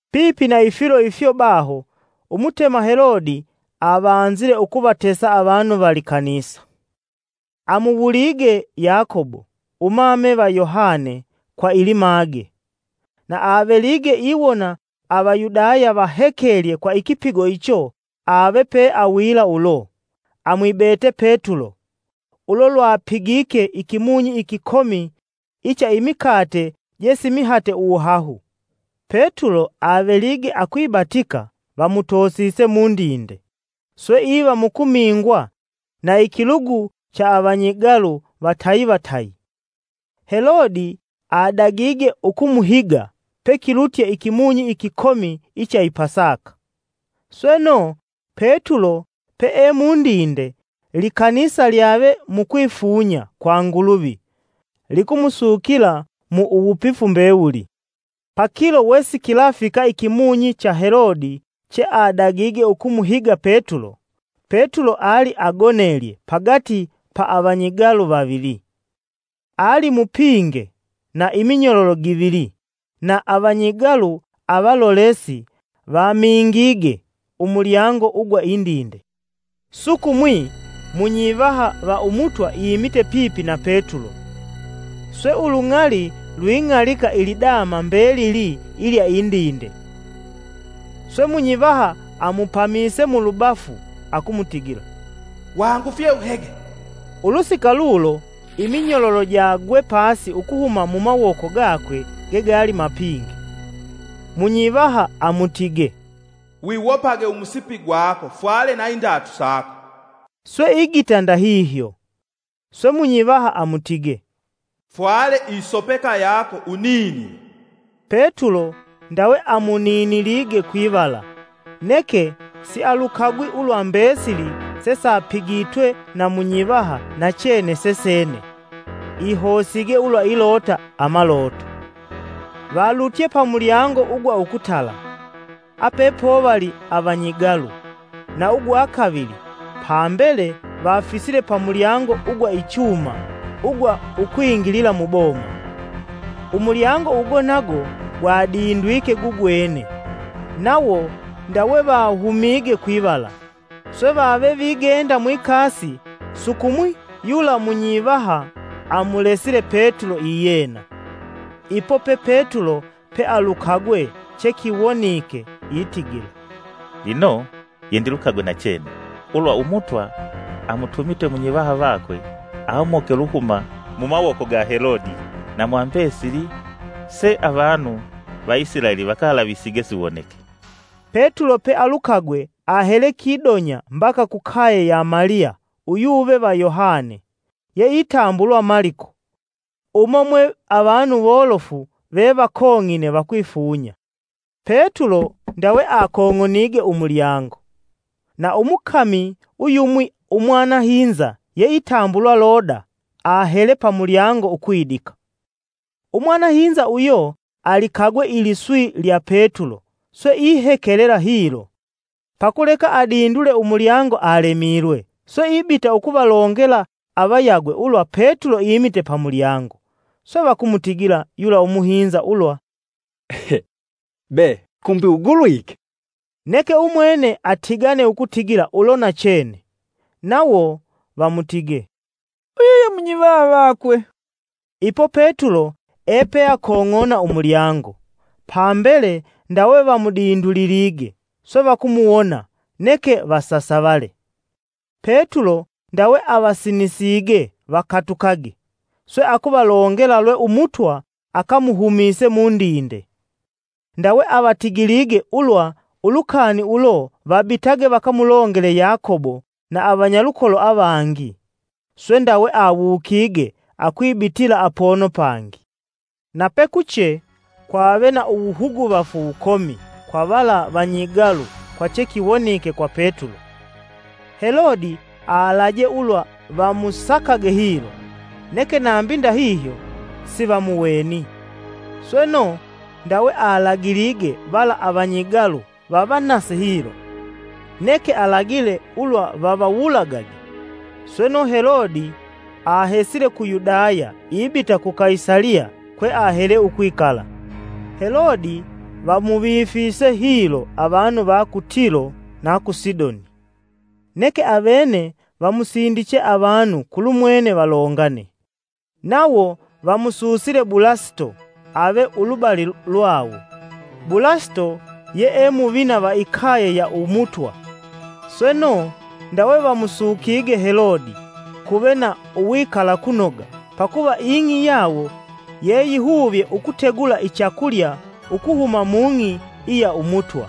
Pipi na Ifilo ifyo baho Umutema Helode avanzile ukuvatesa avanu va likanisa. Amuwulige Yakobo umame va Yohane kwa ilimage. Na avelige iwona Avayudaya vahekelye kwa ikipigo icho, ave peawila ulo, amwibete Petulo (Ulo lwapigike ikimunyi ikikomi icha imikate je simihate uwuhahu.) Petulo avelige akwibatika, vamutosise mundinde, swe iva mukumingwa na ikilugu cha avanyigalu vatayi, vatayi. Helode adagige ukumuhiga pekilutye ikimunyi ikikomi icha i Pasaka. Sweno, Petulo peemundinde, likanisa lyave mukwifunya kwa Nguluvi likumusukila kwa uwupifu mbewuli. Pakilo, wesikilafika ikimunyi cha Helode cheadagige ukumuhiga Petulo, Petulo ali agonelye pagati ya avanyigalu vavili. Alimupinge na iminyololo givili na avanyigalu avalolesi vamingige umulyango ugwa Indinde. Sukumwi, munyivaha va Umutwa imite pipi na Petulo swe ulung'ali lwing'alika ilidama mbelili ilya indinde. Swe munyivaha amupamise mulubafu akumutigila, “Wawangufye uhege!” ulusika lulo iminyololo jagwe pasi ukuhuma mumawoko gakwe ge gali mapinge. Munyivaha amutige, “Wiwopage umusipi gwako fwale na indatu sako.” Swe igita ndahihyo. Swe munyivaha amutige, “Fwale isopeka yako, uninile.” Petulo ndawe amuninilige kwivala, neke sialukagwi ulwa mbesili sesapigitwe na munyivaha nachene sesene, ihosige ulwa ilota amaloto. Valutye pamulyango ugwa ukutala, apepovali avanyigalu, na ugwa kavili, pambele vafisile pamulyango ugwa ichuma ugwa ukwingilila muboma. Umulyango ugo nago gwadindwike gugwene, nawo ndawe vahumige kwivala. Swe vave vigenda mwikasi sukumwi yula munyivaha amulesile Petulo iyena. Ipo pe Petulo pealukagwe chekiwonike, itigila, “Lino yendilukagwe nachene ulwa Umutwa amutumite munyivaha vakwe amoke uluhuma mumawoko ga Helodi na mwa mbesili seavanu va Isilaeli vakalavisige siwoneke.” Petulo pealukagwe ahele kidonya mbaka kukaye ya Maliya uyuve va Yohane yeitambulwa Maliko. Umo mwe avanu wolofu vevakong'ine vakwifunya. Petulo ndawe akong'onige umulyango na umukami uyumwi umwanahinza yeitambulwa Loda, ahele pamulyango ukwidika. Umwanahinza uyo alikagwe iliswi lya Petulo swe ihekelela hilo, pakuleka adindule umulyango alemilwe swe ibita ukuvalongela avayagwe ulwa Petulo imite pamulyango. Swe vakumutigila yula umuhinza ulwa, “Be kumbi ugulwike!” Neke umwene atigane ukutigila ulo nachene. Nawo vamutige, “Uyo ye munyivaha vakwe.” Ipo Petulo epeakong'ona umulyango. Pambele ndawe vamudindulilige, swe vakumuwona neke vasasavale. Petulo ndawe avasinisige vakatukage, swe akuvalongela lwe Umutwa akamuhumise mundinde. Ndawe avatigilige ulwa ulukani ulo vabitage vakamulongele Yakobo na avanyalukolo avangi, swe ndawe awukige akwibitila apono pangi. Na pekuche, kwave na uwuhuguvafu wukomi kwa vala vanyigalu kwa chekiwonike kwa Petulo. Helode alaje ulwa vamusakage hilo, neke nambi ndahihyo sivamuweni. Sweno, ndawe alagilige vala avanyigalu vavanase hilo. neke alagile ulwa vavawulagage. Sweno, Helode ahesile ku Yudaya ibita ku Kaisaliya kweahele ukwikala. Helode vamuvifise hilo avanu va ku Tilo na ku Sidoni. Neke avene vamusindiche avanu kulumwene valongane. Nawo vamususile Bulasito ave ulubali lwawo. Bulasito yee muvina va ikaye ya Umutwa. Sweno, ndawe vamusukige Helode kuve na uwikalakunoga, pakuva ing'i yawo yeyihuvye ukutegula ichakulya ukuhuma mung'i iya Umutwa.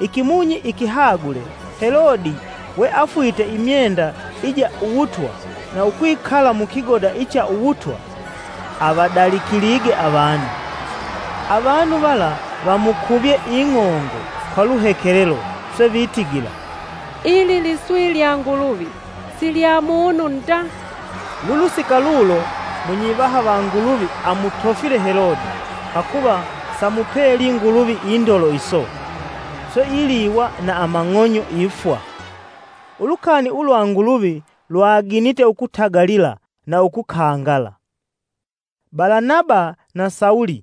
Ikimunyi ikihagule, Helode we afwite imyenda ija uwutwa na ukwikala mukigoda icha uwutwa, avadalikilige avanu. Avanu vala vamukuvye ing'ongo kwa luhekelelo swe vitigila, “Ili liswi lya Nguluvi, si lya munu nda.” Lulusika lulo munyivaha va Nguluvi amutofile Helode pakuva samupeli Nguluvi indolo iso. Swe iliiwa na amang'onyo ifwa. Ulukani ulwa Nguluvi lwaginite ukutagalila na ukukangala. Balanaba na Sawulo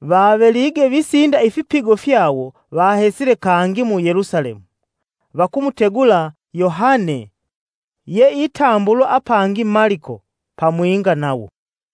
vavelige visinda ifipigo fyawo, vahesile kangi mu Yelusalemu, vakumutegula Yohane yeitambulwa apangi Maliko pamwinga nawo.